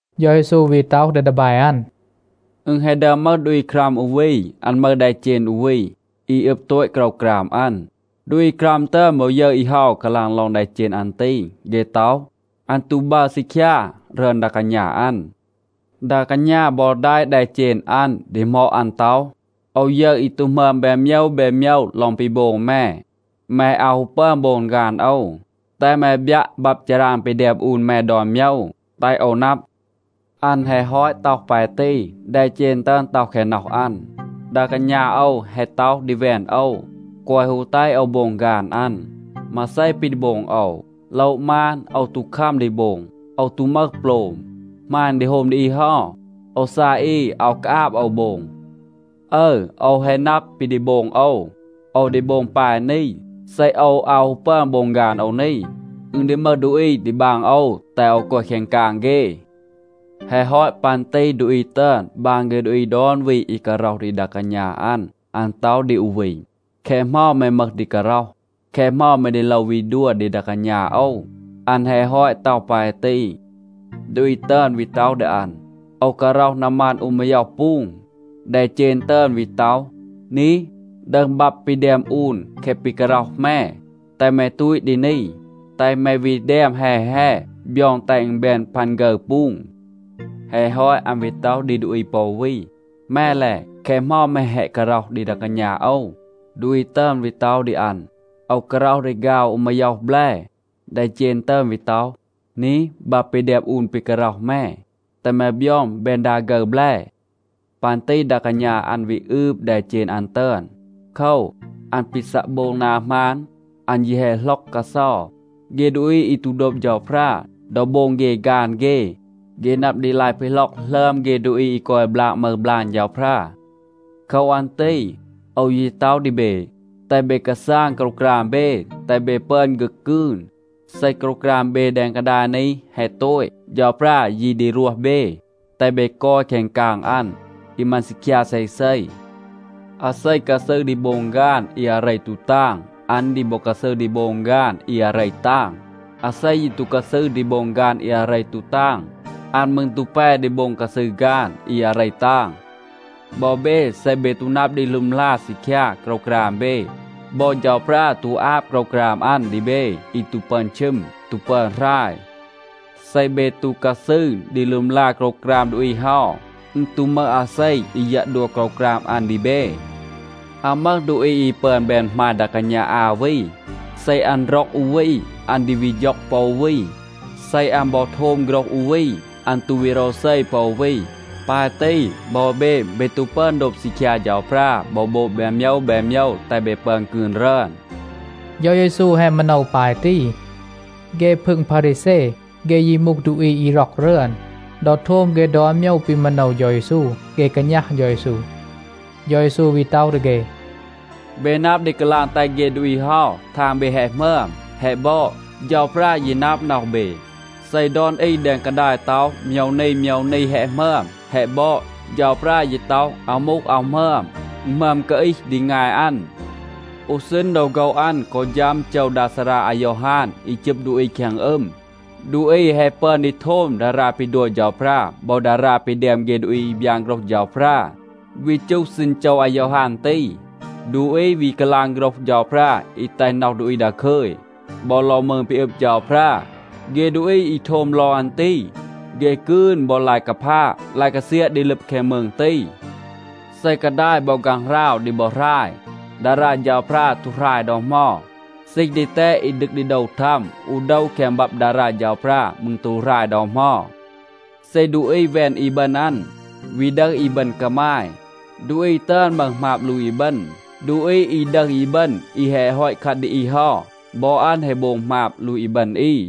เฌา เยซู วี ต็อห ดี ดีแบ อัน, “อึณ แฮะ ดึอม มึห ดูอี ครัม อู วี. อัน มึห แดเจณ อู วี, อี อึบ โตต โกรวกราม อัน. ดูอี ครัม ตึอน บอ ยึร อี เฮา กาลาง ลอง แดเจณ อัน ตี. เฆ ต็อห, อัน ตู บัร ซีคยา รึอน ดา กาณา อัน. ดา กาณา บอ แดะ แดเจณ อัน, ดีหมอด อัน ต็อห, ‘โอว ยึร อี ตู หมึอม แบน โมยว แบน โมยว ลอง ปี โบง แม. แม อาว ฮู ปึอน โบง ฆาน โอว. แตห แม บยัะ บับ ฌาราง ปี แดม อูน แม ดอน โมยว, แตห โอว นับ.’ อัน แฮะ ฮอต ต็อห ปาย ตี, แดเจณ ตึอน ต็อห แคง น็อห อัน, ‘ดา กาณา โอว แฮะ ต็อห ดี แวน โอว, แกวะ ฮู แตห โอว โบง ฆาน อัน. มาเซ ปี ดี โบง โอว? โละ มาน, โอว ตู คัม ดี โบง. โอว ตู มึห โปลม. หมาณ ดี โฮม ดี อี เฮา, โอว ซาย อี. อาว กาอาบ โอว โบง. อึร, โอว แฮะ นับ ปี ดี โบง โอว. โอว ดี โบง ปาย นี. เซ โอว อาว ฮู ปึอน โบง ฆาน โอว นี, อึณ ดี มึห ดูอี ดี บาง โอว แตห โอว กอย แคง กาง เฆ.’ แฮะ ฮอต ปัน ตี ดูอี ตึอน บาง เฆ ดูอี ดอน วี อี การ็อห ดี ดา กาณา อัน. อัน ต็อห ดี อู วี, ‘แคะ เหมา แม มึห ดี การ็อห? แคะ เหมา แม ดี โลว วี ดัว ดี ดา กาณา โอว?’ อัน แฮะ ฮอต ต็อห ปาย ตี, ดูอี ตึอน วี ต็อห ดี อัน, ‘โอว การ็อห นามัน อู มาย็อห ปูง.’ แดเจณ ตึอน วี ต็อห, ‘นี, ดึห บับ ปี แดม อูน แคะ ปี การ็อห แม. แตห แม ตูต ดี นี, แตห แม วี แดม แฮ แฮ, บยอง แตห อึณ แบน พัน ฆึร ปูง.’ แฮะ ฮอต, อัน วี ต็อห ดี ดูอี ปอ อู วี, ‘แม และ? แคะ เหมา แม แฮะ การ็อห ดี ดา กาณา โอว?’ ดูอี ตึอน วี ต็อห ดี อัน, ‘โอว การ็อห ดีฆาว อู มาย็อห แบล.’ แดเจณ ตึอน วี ต็อห, ‘นี, บับ ปี แดม อูน ปี การ็อห แม. แตห แม บยอง แบน ดา ฆึร แบล.’ ปัน ตี ดา กาณา อัน วี อืบ แดเจณ อัน ตึอน. โคว, อัน ปี ซัะ โบง นา หมาน, อัน ยี แฮะ หล็อก กาเซา. เฆ ดูอี อี ตู โดบ เฌาพรา, ดอ โบง เฆ ฆาน เฆ, เฆ นับ ดี ลาย ปีหล็อก หลึอม เฆ ดูอี อี กอย บลาก มึห บลาง เฌาพรา. โคว อัน ตี โอว ยี ต็อห ดี เบ, แตห เบ กาซาง โกรวกราม เบ, แตห เบ ปึอน ฆึก กืน. เซ โกรวกราม เบ แดง กาดาย นี แฮะ โตต, เฌาพรา ยี ดี รวห เบ, แตห เบ กอย แคง กาง อัน, อี มัน ซีคยา เซเซ. อาเซ กาซืร ดี โบง ฆาน อี อาเร ตู ตาง, อัน ดี บอ กาซืร ดี โบง ฆาน อี อาเร ตาง. อาเซ ยี ตู กาซืร ดี โบง ฆาน อี อาเร ตู ตาง, อัน มืร ตู แป ดี โบง กาซืร ฆาน อี อาเร ตาง. บอ เบ, เซ เบ ตู นับ ดี ลึมลา ซีคยา โกรวกราม เบ, บอ เฌาพรา ตู อาบ โกรวกราม อัน ดี เบ อี ตู ปึอน ชึม, ตู ปึอน หราย. เซ เบ ตู กาซืร ดี ลึมลา โกรวกราม ดูอี เฮา, อึณ ตู มึห อาเซ อี ยัะ ดัว โกรวกราม อัน ดี เบ. อาว มึห ดูอี อี ปึอน แบน หมาย ดา กาณา อา วี. เซ อัน ร็อก อู วี, อัน ดี วี ฌ็อง ปอ อู วี. เซ อัน บอ โทม โฆรห อู วี, อัน ตู วี โรวเซ ปอ อู วี. ปาย ตี, บอ เบ, เบ ตู ปึอน โดบ ซีคยา เฌาพรา บอ โบง แบน โมยว แบน โมยว แตห เบ ปึอน กืน รึอน.” เฌา เยซู แฮะ มาโนว ปาย ตี. เฆ พึง พารีแซ, เฆ ยี มูห ดูอี อี ร็อก รึอน. ดอ โทม เฆ ดอน โมยว ปี มาโนว เฌา เยซู, เฆ กาณัห เฌา เยซู. เฌา เยซู วี ต็อห ดี เฆ, “เบ นับ ดี กาลาง แตห เฆ ดูอี เฮา ทาง เบ แฮะ หมึอม แฮะ บอด. เฌาพรา ยี นับ น็อห เบ. เซ ดอน อี แดง กาดาย ต็อห, โมยว นี โมยว นี แฮะ หมึอม, แฮะ บอด, เฌาพรา ยี ต็อห, อาว มูห, อาว หมึอม. อึณ หมึอม กาอีห ดี งาย อัน. อู ซีณ ดอ โฆว อัน กอ ฌัม โจว ดา ซารา อายอฮาน อี จึบ ดูอี แคง อึม, ดูอี แฮะ ปึอน ดี โทม ดารา ปี ดัว เฌาพรา บอ ดารา ปี แดม เฆ ดูอี อี บยาน โฆรห เฌาพรา. วี จูห ซีณ โจว อายอฮาน ตี, ดูอี วี กาลาง โฆรห เฌาพรา อี แตห น็อห ดูอี ดาคึย, บอ ลอง มืง ปี อึบ เฌาพรา. เฆ ดูอี อี โทม ลอง อัน ตี, เฆ กืน บอ ลาย กาพาะ, ลาย กาเซียะ ดี ลึบ แคง มืง ตี. เซ กาดาย บอ ฆางหราว ดี บอ หราย, ดารา เฌาพรา ตู หราย ดอ เหมา. ซีห ดีแตด อี ดึก ดี โดว ทัม อู โดว แคง บับ ดารา เฌาพรา มืร ตู หราย ดอ เหมา. เซ ดูอี แวน อีบึณ อัน, วี ดึห อีบึณ กามาย, ดูอี ตึอน มึห หมาบ ลูต อีบึณ. ดูอี อี ดึห อีบึณ อี แฮะ ฮอต คัด ดี อี เฮา, บอ อัน แฮะ โบง หมาบ ลูต อีบึณ อี.”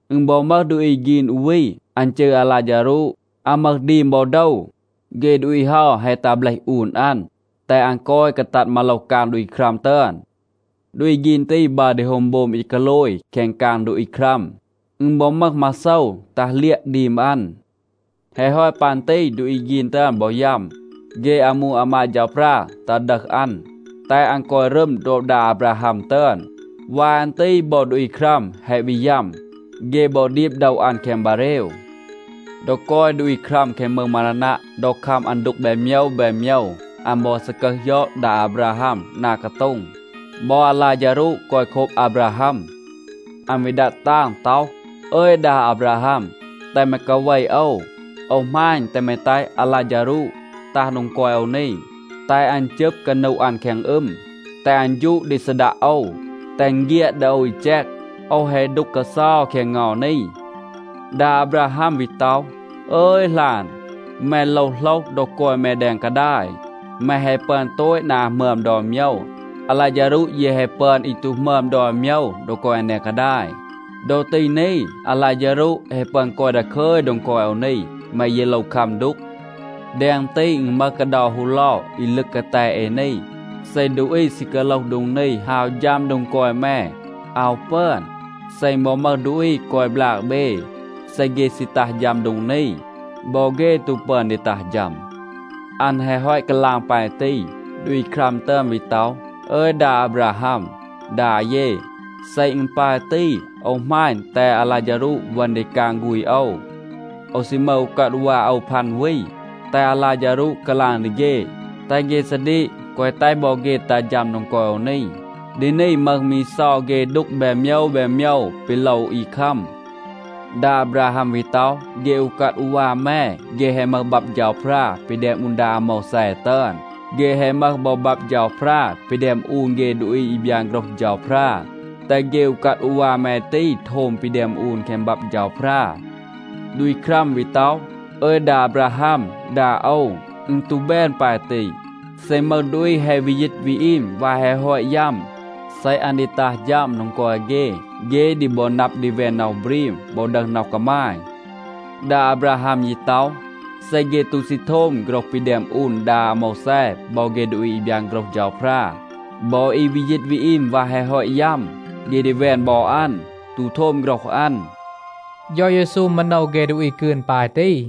อึณ บอ มึห ดูอี ฆีน อู วี. อัน จืร อาลาฌารูด. อัน มึห ดีม บอ โดว. เฆ ดูอี เฮา แฮะ ตัห เบลห อูน อัน, แตห อัน กอย กาตัด มาโลห กาง ดูอี ครัม ตึอน. ดูอี ฆีน ตี บัร ดี โฮม โบม อี กาโลย แคง กาง ดูอี ครัม. อึณ บอ มึห มาโซว ตัห เลียะ ดีม อัน. แฮะ ฮอต ปัน ตี ดูอี ฆีน ตึอน บอ ยัม. เฆ อามู อามาด เฌาพรา ตัห ดึห อัน, แตห อัน กอย รึม โดบ ดา อาบราฮัม ตึอน. วาย อัน ตี บอ ดูอี ครัม แฮะ วี ยัม. เฆ บอ ดีบ โดว อัน แคง บาเรว. ดอ กอย ดูอี ครัม แคง มืง มารานัะ, ดอ คัม อัน ดูก แบน โมยว แบน โมยว, อัน บอ ซากึห ยอด ดา อาบราฮัม นา กาโต็ง. บอ อาลาฌารูด กอย โคบ อาบราฮัม. อัน วี ดัด ตาง ต็อห, ‘อึย ดา อาบราฮัม, แตห แม กาเว โอว. โอว หมาณ, แตห แม แตห อาลาฌารูด ตัห โดง กอย โอว นี, แตห อัน จึบ กานู อัน แคง อึม, แตห อัน ฌูด ดี ซีดัะ โอว, แตห อึณ เฆียด ดี โอว อี แจก. โอว แฮะ ดูก กาเซา แคง เงา นี.’ ดา อาบราฮัม วี ต็อห, ‘อึย หลาน, แม โลว โหลห, ดอ กอย แม แดง กาดาย, แม แฮะ ปึอน โตต นา หมึอม ดอน โมยว. อาลาฌารูด ยี แฮะ ปึอน อี ตู หมึอม ดอน โมยว ดอ กอย อัน แดง กาดาย. ดอ ตี นี, อาลาฌารูด แฮะ ปึอน กอย ดาคึย โดง กอย โอว นี. แม ยี โลว คัม ดูก. แดง ตี, อึณ มึห กาเดา ฮูเลา อี ลึก กาแต เอ นี. เซ ดูอี ซี กาโลห โดง นี, ฮาว ฌัม โดง กอย แม, อาว ปึอน. เซ อึณ บอ มึห ดูอี กอย บลาก เบ, เซ เฆ ซี ตัห ฌัม โดง นี, บอ เฆ ตู ปึอน ดี ตัห ฌัม.’ อัน แฮะ ฮอต กาลาง ปาย ตี, ดูอี ครัม ตึอน วี ต็อห, ‘อึย ดา อาบราฮัม, ดา เย, เซ อึณ ปาย ตี, โอว หมาณ, แตห อาลาฌารูด เวณ ดี กาง ฆูณ โอว. โอว ซี มึห อูกัด อูวา โอว พัน วี. แตห อาลาฌารูด กาลาง ดี เฆ, แตห เฆ ซาดีก, แกวะ แตห บอ เฆ ตัห ฌัม โดง กอย โอว นี. ดี นี มึห มี เซา เฆ ดูก แบน โมยว แบน โมยว ปี โลว อี คัม.’ ดา อาบราฮัม วี ต็อห, ‘เฆ อูกัด อูวา แม, เฆ แฮะ มึห บับ เฌาพรา ปี แดม อูน ดา อาโมวแซ ตึอน. เฆ แฮะ มึห บอ บับ เฌาพรา ปี แดม อูน เฆ ดูอี อี บยาน โฆรห เฌาพรา. แตห เฆ อูกัด อูวา แม ตี โทม ปี แดม อูน แคง บับ เฌาพรา.’ ดูอี ครัม วี ต็อห, ‘อึย ดา อาบราฮัม, ดา โอว, อึณ ตู แบน ปาย ตี. เซ มึห ดูอี แฮะ วี ยีต วี อีม วาย แฮะ ฮอต ยัม, เซ อัน ดี ตัห ฌัม โดง กอย เฆ, เฆ ดี บอ นับ ดี แวน น็อห บรีม บอ ดึห น็อห กามาย.’ ดา อาบราฮัม ยี ต็อห, ‘เซ เฆ ตู ซี โทม โฆรห ปี แดม อูน ดา อาโมวแซ บอ เฆ ดูอี อี บยาน โฆรห เฌาพรา, บอ อี วี ยีต วี อีม วาย แฮะ ฮอต ยัม, เฆ ดี แวน บอ อัน, ตู โทม โฆรห อัน.’” เฌา เยซู มาโนว เฆ ดูอี กืน ปาย ตี.